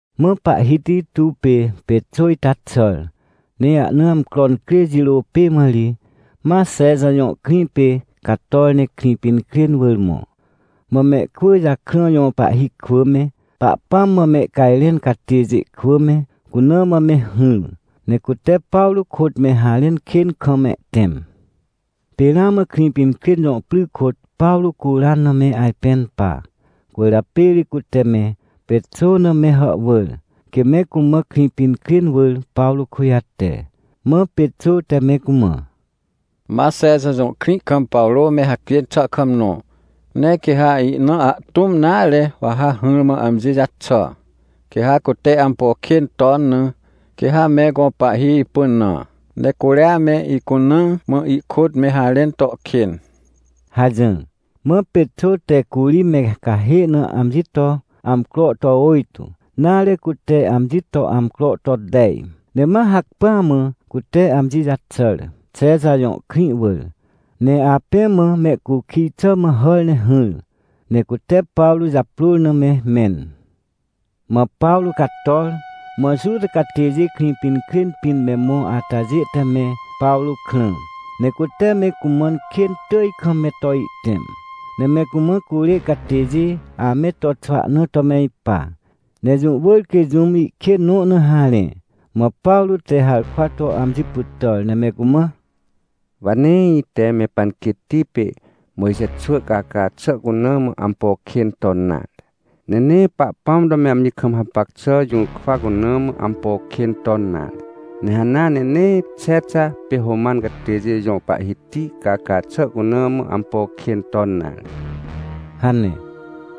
Mã pahhiti tuw pê Pexô ita xàr, ne ahna amcro incrê jirô pê mã ri, ma Xexa jõ krĩ pê cator ne Krĩpinkrên wỳr mõ. Mã mehkwỳ jakrã jõ pahhi kwỳ me, Pahpãm mã mehcajrẽn catêjê kwỳ me, cuna mã me hỹr, ne cute Pawrô kôt me harẽn kên kam mehtẽm. Pê ramã Krĩpinkrên jõ pry kôt Pawrô curan na me ajpẽn pa. Cwỳrjapê ri cute me Pexô na me hàhwỳr, quê me cumã Krĩpinkrên wỳr Pawrô kujate. Mã Pexô te me cumã: — Ma Xexa jõ krĩ kam Pawrô me hacjên xà kam nõ. Ne quê ha ina ahtũm nare wa ha hỹrmã amji jaxà. Quê ha cute ampo kên ton na, quê ha me gõ pahhi ipynã, ne curia me icunaa mã ihkôt me harẽn to kên — hajỹr. Mã Pexô te curi me cahê na amji to amcro to ôjtô, nare, cute amji to amcro to tej, ne ma hacpỹa mã cute amji jaxàr, Xexa jõ krĩ wỳr. Ne apẽ mã mehcukij xà mã hàr ne hỹr, ne cute Pawrô japrôr na me mẽn. Mã Pawrô cator, mã Juta catêjê Krĩpinkrên pĩn me mõ atajê te me Pawrô krã, ne cute me cumãn kên tỳj kam me to ihtẽm. Ne me cumã curê catêjê ame to xwahna to me ipa, ne jũ wỳr quê jũm ihkên nõ na harẽ. Mã Pawrô te harkwa to amji pytàr, ne me cumã: — Wa nee ite me panquêtti pê Mojxe xwỳ caca xà cuna mã ampo kên ton nare, ne nee Pahpãm to me amji kam hapac xà jũrkwa cuna mã ampo kên ton nare, ne hanea ne nee Xexa pê Roman catêjê jõ pahhiti caca xà cuna mã ampo kên ton nare — hane.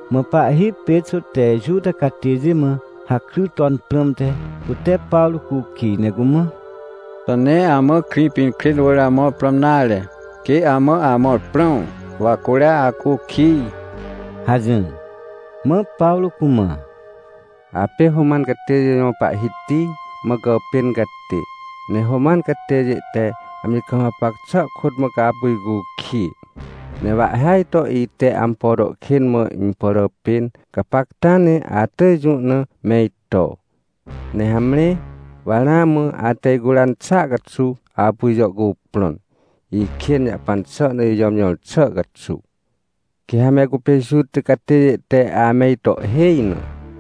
Mã pahhi Pexô te Juta catêjê mã hakry ton prãmte, cute Pawrô cukij, ne cumã: — Xà nee amã Krĩpinkrên wỳr amõr prãm nare, quê amã amõr prãm, wa curia acukij? — hajỹr. Mã Pawrô cumã: — Apê Roman catêjê jõ pahhiti mã gàpên catê, ne Roman catêjê te amji kam hapac xà kôt mã ca apu icukij. Ne wa ihhêaj to ite ampo to kên pàràpên, gapacta ne atỳj jũ na me ito. Ne hamre, wa ramã ate icuran xàa caxuw apu ijàhcuprõn, ikên jahpan xà na ijàmjõr xà caxuw. Quê ha me cupê Juta catêjê te ame ito ihhêj na,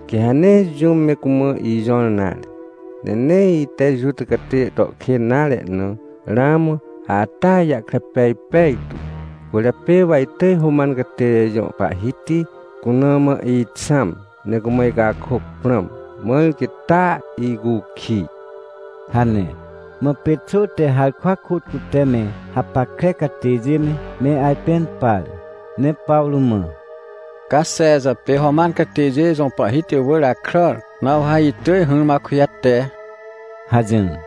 quê ha nee jũm me cumã ijõr nare. Ne nee ite Juta catêjê to kên nare na, ramã atea ijahkre pej pejtu. Cwỳrjapê wa itỳj Roman catêjê jõ pahhiti cuna mã ixãm, ne cumã icakôc prãm, mãr quê taa icukij — hane. Mã Pexô te harkwa kôt cute me hapackre catêjê me, me ajpẽn par, ne Pawrô mã: — Ca Xexa pê Roman catêjê jõ pahhiti wỳr akràr, na wa ha itỳj hỹrmã akujate — hajỹr.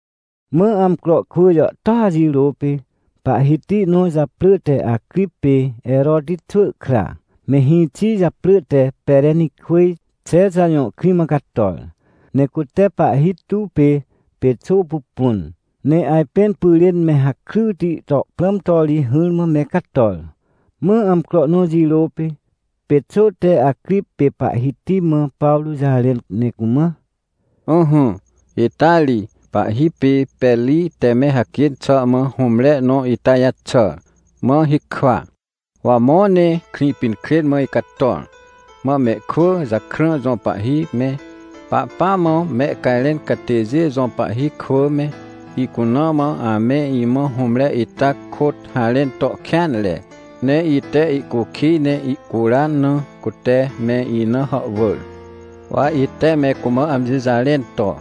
Mã amcro kwỳ jàhtôa jirô pê, pahhiti nõ japrỳ te Acrip pê Heroti xwỳ kra, me hĩxi japrỳ te Perenikwỳj Xexa jõ krĩ mã cator. Ne cute pahhi tuw pê Pexô pupun, ne ajpẽn pyrên me hakryti to prãm to ri hỹrmã me cator. Mã amcro nõ jirô pê, Pexô te Acrip pê pahhiti mã Pawrô jarẽn ne cumã: — Ỹhỹ, ita ri pahhi pê Peri te me hacjên xà mã hũmre nõ ita jaxàr, mã hikwa. Wa mõ ne Krĩpinkrên mã icator, mã mehkwỳ jakrã jõ pahhi me, Pahpãm mã mehcajrẽn catêjê jõ pahhi kwỳ me, icuna mã ame imã hũmre ita kôt harẽn to kêanre, ne ite ihcukij ne ihcuran na, cute me ina hàhwỳr. — Wa ite me cumã amji jarẽn to: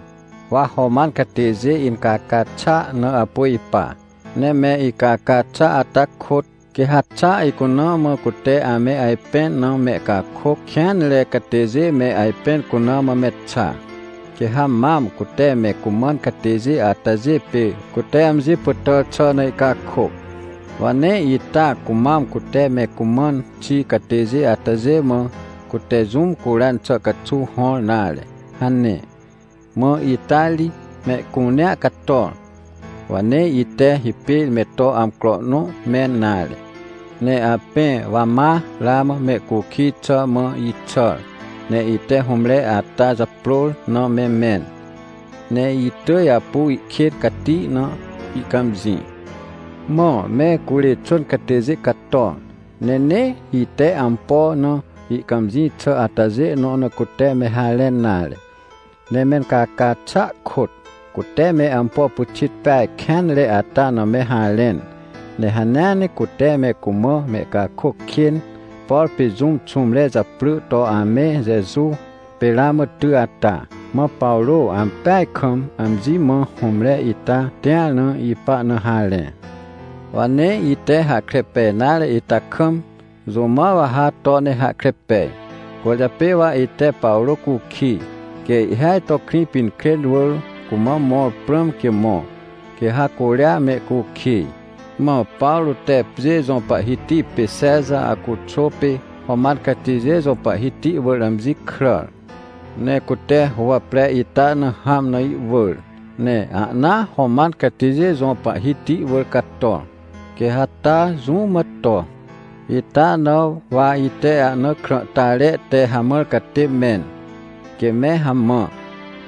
“Wa Roman catêjê incaca xàa na apu ipa. Ne me icaca xà ata kôt, quê ha xa icuna mã cute ame ajpẽn na mehcakôc kêanre catêjê me ajpẽn cuna mã me xa. Quê ha mam cute me cumãn catêjê atajê pê cute amji pytàr xà na ihcakôc. Wa nee ita cumam cute me cumãn xi catêjê atajê mã, cute jũm curan xà caxuw hõr nare” hane. — Mã ita ri mehcunea cator, wa nee ite hipêr me to amcro nõ mẽn nare, ne apẽ wa ma ramã mehcukij xà mã ixàr, ne ite hũmre ata japrôr na me mẽn, ne itỳj apu ihkên cati na ihcãmjĩ. Mã me curê xwỳn catêjê cator, ne nee ite ampo na ihcãmjĩ xà atajê nõ na cute me harẽn nare. Ne mencaca xàa kôt, cute me ampo pyxit peaj kênre ata na me harẽn. Ne hanea ne cute me cumã mehcakôc kên, por pê jũm xũmre japrỳ to ame Jeju, pê ramã ty ata, mã Pawrô ampeaj kam amji mã hũmre ita tĩar na ipa na harẽ. Wa nee ite hahkre pej nare ita kam, jũ mã wa ha to ne hahkre pej. Cwỳrjapê wa ite Pawrô cukij, quê ihhêaj to Krĩpinkrên wỳr cumã mõr prãm quê mõ, quê ha curia mehcukij. Mã Pawrô te pjê jõ pahhiti pê Xexa Aguxô pê Roman catêjê jõ pahhiti wỳr amji kràr, ne cute huwapre ita na hãm na iwỳr, ne ahnaa Roman catêjê jõ pahhiti wỳr cato, quê ha taa jũ mã to. Ita na wa ite ahna krãhtare te hamãr catê mẽn, quê me hamã,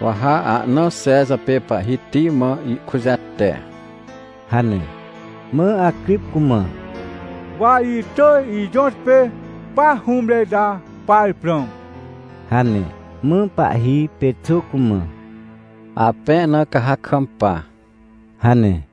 wa ha ahnaa Xexa pê pahhiti mã ihkujate — hane. Mã Acrip cumã: — Wa itỳj ijõtpê pa hũmre ita par prãm — hane. Mã pahhi Pexô cumã: — Apẽ na ca ha kampa — hane.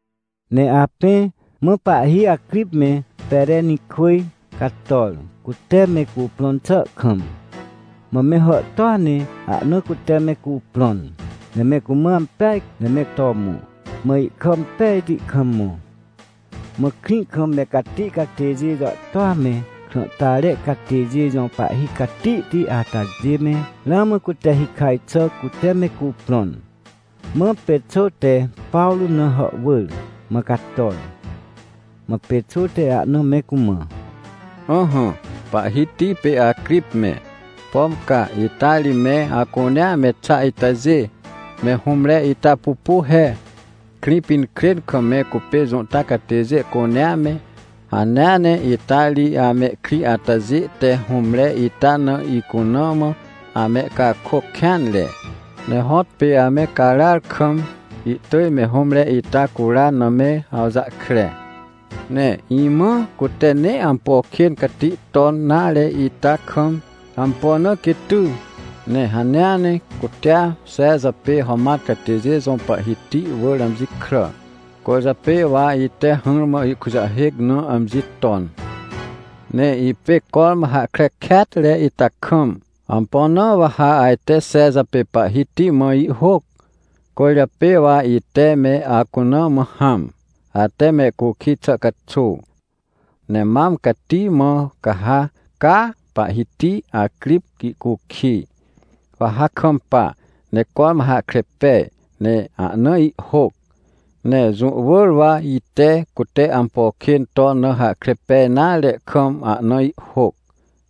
Ne apẽ, mã pahhi Acrip me Perenikwỳj cator, cute me cuprõn xà kam. Mã me hàhtôa ne ahna cute me cuprõn, ne me cumã ampeaj ne me to mõ, mã ihkà impejti kam mõ. Mã krĩ kam me cati catêjê jàhtôa me, krãhtare catêjê jõ pahhi catihti atajê me, ramã cute hikaj xà cute me cuprõn. Mã Pexô te Pawrô na hàhwỳr mã cator. Mã Pexô te ahna me cumã: — Ỹhỹ, pahhiti pê Acrip me, pom ca ita ri me acunea me xa itajê, me hũmre ita pupu he! Krĩpinkrên kam me cupê Juta catêjê cunea me, hanea ne ita ri amehkrĩ atajê te hũmre ita na icuna mã amehcakôc kêanre. Ne hõtpê ame caràar kam, ihtỳj me hũmre ita curan na me awjahkre. Ne imãa cute nee ampo kên cati ton nare ita kam, ampo na quê ty? Ne hanea ne cutea Xexa pê Roman catêjê jõ pahhiti wỳr amji kràr, cwỳrjapê wa ite hỹrmã ihkujahêc na amji ton. Ne ipê cormã hahkre kêatre ita kam, ampo na wa ha ajte Xexa pê pahhiti mã ihhôc? Cwỳrjapê wa ite me acuna mã hãm, ate mehcukij xà caxuw. Ne mam cati mã ca ha, caa, pahhiti Acrip ihcukij. Wa ha kampa, ne cormã hahkre pej, ne ahna ihhôc. Ne jũ wỳr wa ite cute ampo kên ton na hahkre pej nare kam ahna ihhôc,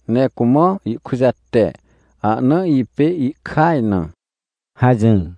ne cumã ihkujate, ahna ipê ihkaj na — hajỹr.